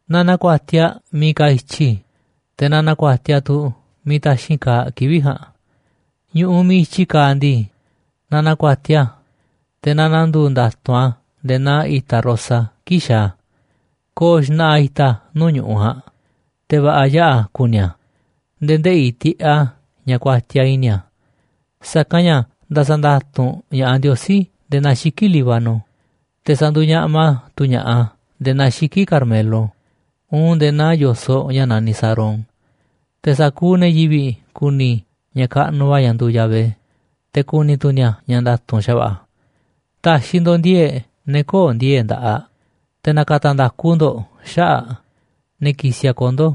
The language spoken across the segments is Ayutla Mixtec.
Na na̱ku̱a̱tiaꞌ miiꞌ kaaꞌ i̱tyi, te̱ na na̱ku̱a̱tiaꞌ tu̱ miiꞌ taxi̱nꞌ kaaꞌ kivi̱ꞌ ja̱a̱nꞌ. Ñu̱ꞌuꞌ miiꞌ i̱tyiꞌ kaaꞌ ndii, na na̱ku̱a̱tiaꞌ a̱, te̱ na na̱ndu̱u̱ nda̱tu̱nꞌ a̱ nde̱e̱ naa i̱ta̱ rosa kii̱ꞌ xaaꞌ a̱. Ko̱o̱ xna̱ꞌa̱ i̱ta̱ nuu̱ꞌ ñu̱ꞌuꞌ ja̱a̱nꞌ, te̱ va̱ꞌa̱ yaꞌa̱ ku̱ni̱ a̱ nde̱e̱ ndeꞌi̱ tiꞌeꞌ a̱ ña̱ kuatiaꞌ i̱ni̱ a̱. Sa̱kanꞌ ña̱ nda̱sa̱ nda̱tu̱nꞌ ña̱ꞌaꞌ Ndiosí nde̱e̱ naa xiki̱ꞌ Líbano, te̱ sa̱ndu̱u̱ ñaꞌma tu̱ ña̱ꞌaꞌ a̱ nde̱e̱ naa xiki̱ꞌ Carmelo uun nde̱e̱ naa yo̱soꞌ ña̱ naniꞌ Sarón. Te̱ sa̱kuuꞌ ne̱ yivi̱ꞌ ku̱ni̱ ña̱ kaꞌnuꞌ va̱ ña̱ nduuꞌ Yahvé, te̱ ku̱ni̱ tu̱ ni̱a̱ ña̱ nda̱tu̱nꞌ xa̱va̱ꞌa̱ a̱. Ta̱xi̱ ndo̱ꞌ ndi̱e̱e̱ꞌ ne̱ köo̱ꞌ ndi̱e̱e̱ꞌ nda̱ꞌaꞌ, te̱ na̱ka̱ta̱ nda̱ku ndo̱ꞌ xaꞌa̱ꞌ ne̱ kisiꞌ a̱ kondo̱.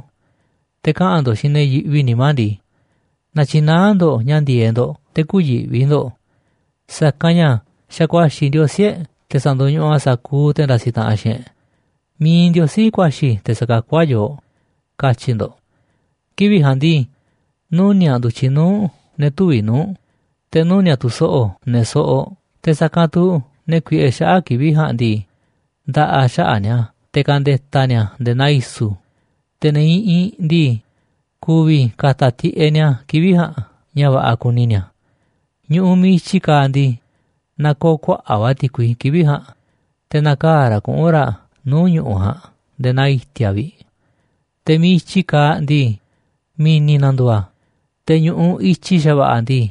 Te̱ kaꞌa̱n ndo̱ꞌ xiinꞌ ne̱ yiꞌvi nimá ndii: “Na̱tyi̱naá ndo̱ꞌ ña̱ ndi̱e̱eꞌ ndo̱ꞌ, te̱ kü̱yi̱ꞌvi ndo̱ꞌ. Sa̱kanꞌ ña̱ xa̱ ku̱a̱xi̱ Ndiosí e̱ꞌ te̱ sa̱ndo̱ñuꞌuꞌ a̱ sa̱kuuꞌ te̱ ndasiꞌ taꞌanꞌ xiinꞌ e̱ꞌ. Mi̱iꞌ Ndiosí ku̱a̱xi̱ te̱ sa̱kakú a̱ yooꞌ”, katyi̱ ndo̱ꞌ. Kivi̱ꞌ ja̱a̱nꞌ ndii, nuni̱a̱ꞌ ndu̱tyiꞌ nuu̱ꞌ ne̱ tüviꞌ nuu̱ꞌ, te̱ nuni̱a̱ꞌ tu̱ so̱ꞌo̱ ne̱ soꞌoꞌ. Te̱ sa̱kanꞌ tu̱ ne̱ kuiꞌe xaꞌa̱ꞌ kivi̱ꞌ ja̱a̱nꞌ ndii, nda̱ꞌa̱ xaꞌa̱ꞌ ni̱a̱ te̱ ka̱nde̱ta̱ ni̱a̱ nde̱e̱ naa i̱su̱, te̱ ne̱ iꞌinꞌ ndii, ku̱vi̱ ka̱ta̱ tiꞌeꞌ ni̱a̱ kivi̱ꞌ ja̱a̱nꞌ ña̱ va̱ꞌa̱ kuni ni̱a̱. Ñu̱ꞌuꞌ miiꞌ i̱tyi kaaꞌ ndii, na̱koo̱ kuaꞌa̱ꞌ va̱ ti̱kui kivi̱ꞌ ja̱a̱nꞌ, te̱ na̱kaa̱ raꞌ kuꞌu̱n raꞌ nuu̱ꞌ ñu̱ꞌuꞌ ja̱a̱nꞌ nde̱e̱ naa i̱ti̱a̱ vi̱ꞌ. Te̱ miiꞌ i̱tyi kaaꞌ ndii, mi̱ni̱ na̱ndu̱u̱ a̱, te̱ ñu̱ꞌuꞌ i̱tyi xa̱va̱ꞌa̱ ndii,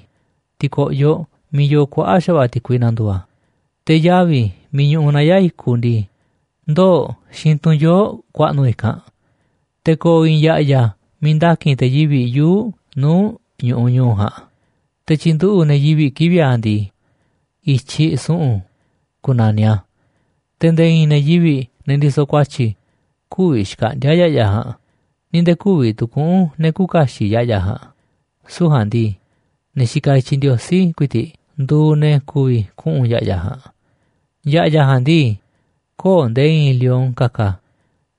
ti̱ko̱ꞌyoꞌ miiꞌ yoo kuaꞌa̱ꞌ xa̱va̱ꞌa̱ ti̱kui na̱ndu̱u̱ a̱, te̱ yavi̱ miiꞌ ñuꞌuꞌ naya̱ꞌ i̱kuꞌ ndii, ndoo̱ꞌ xiinꞌ tunꞌ yoo̱ꞌ ku̱a̱ꞌnu̱ i̱kanꞌ. Te̱ ko̱o̱ i̱i̱n ya̱ꞌya̱ miiꞌ nda̱ki̱n te̱ yivi̱ꞌ yuu̱ꞌ nuu̱ꞌ ñu̱ꞌuꞌ ñu̱u̱ ja̱a̱nꞌ, te̱ tyi̱nduꞌu̱ꞌ ne̱ yivi̱ꞌ kivi̱ꞌ a̱ ndii, I̱tyiꞌ Su̱ꞌu̱n ku̱na̱niꞌ a̱. Te̱ nde̱e̱ i̱i̱n ne̱ yivi̱ꞌ, ne̱ ndisoꞌ ku̱a̱tyi̱, kü̱vi̱ xkaꞌndi̱a̱ ya̱ꞌya̱ ja̱a̱nꞌ ni̱ nde̱e̱ kü̱vi̱ tu̱ kuꞌu̱n ne̱ küuꞌ kaxiꞌ ya̱ꞌya̱ ja̱a̱nꞌ. Süu̱ꞌ ja̱a̱nꞌ ndii, ne̱ xikaꞌ i̱tyiꞌ Ndiosí ku̱i̱ti̱ꞌ nduuꞌ ne̱ ku̱vi̱ kuꞌu̱n ya̱ꞌya̱ ja̱a̱nꞌ. Ya̱ꞌya̱ ja̱a̱nꞌ ndii, köo̱ꞌ nde̱e̱ i̱i̱n lion ka̱ka̱,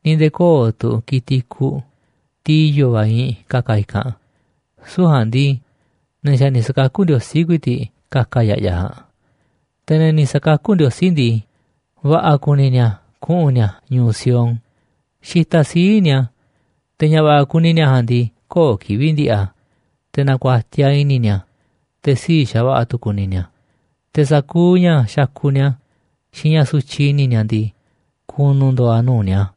ni̱ nde̱e̱ köo̱ꞌ tu̱ ki̱tiꞌ i̱kuꞌ, tiꞌ i̱yo̱ va̱ iinꞌ ka̱ka̱ i̱kanꞌ, süu̱ꞌ ja̱a̱nꞌ ndii, ne̱ xa̱ ni̱ sa̱kakú Ndiosí ku̱i̱ti̱ꞌ ka̱ka̱ ya̱ꞌya̱ ja̱a̱nꞌ. Te̱ ne̱ ni̱ sa̱kakú Ndiosí ndii, va̱ꞌa̱ kuni ni̱a̱ kuꞌu̱n ni̱a̱ ñu̱u̱ Sión xitaꞌ sii̱ꞌ ni̱a̱, te̱ ña̱ va̱ꞌa̱ kuni ni̱a̱ ja̱a̱nꞌ ndii, köo̱ꞌ kivi̱ꞌ ndi̱ꞌi̱ a̱. Te̱ na̱ku̱a̱tiaꞌ i̱ni̱ ni̱a̱, te̱ sii̱ꞌ xa̱va̱ꞌa̱ tu̱ ku̱ni̱ ni̱a̱, te̱ sa̱kuuꞌ ña̱ xakuꞌ ni̱a̱ xiinꞌ ña̱ sutyiꞌ i̱ni̱ ni̱a̱ ndii, ku̱nu̱ ndo̱o̱ a̱ nuu̱ꞌ ni̱a̱.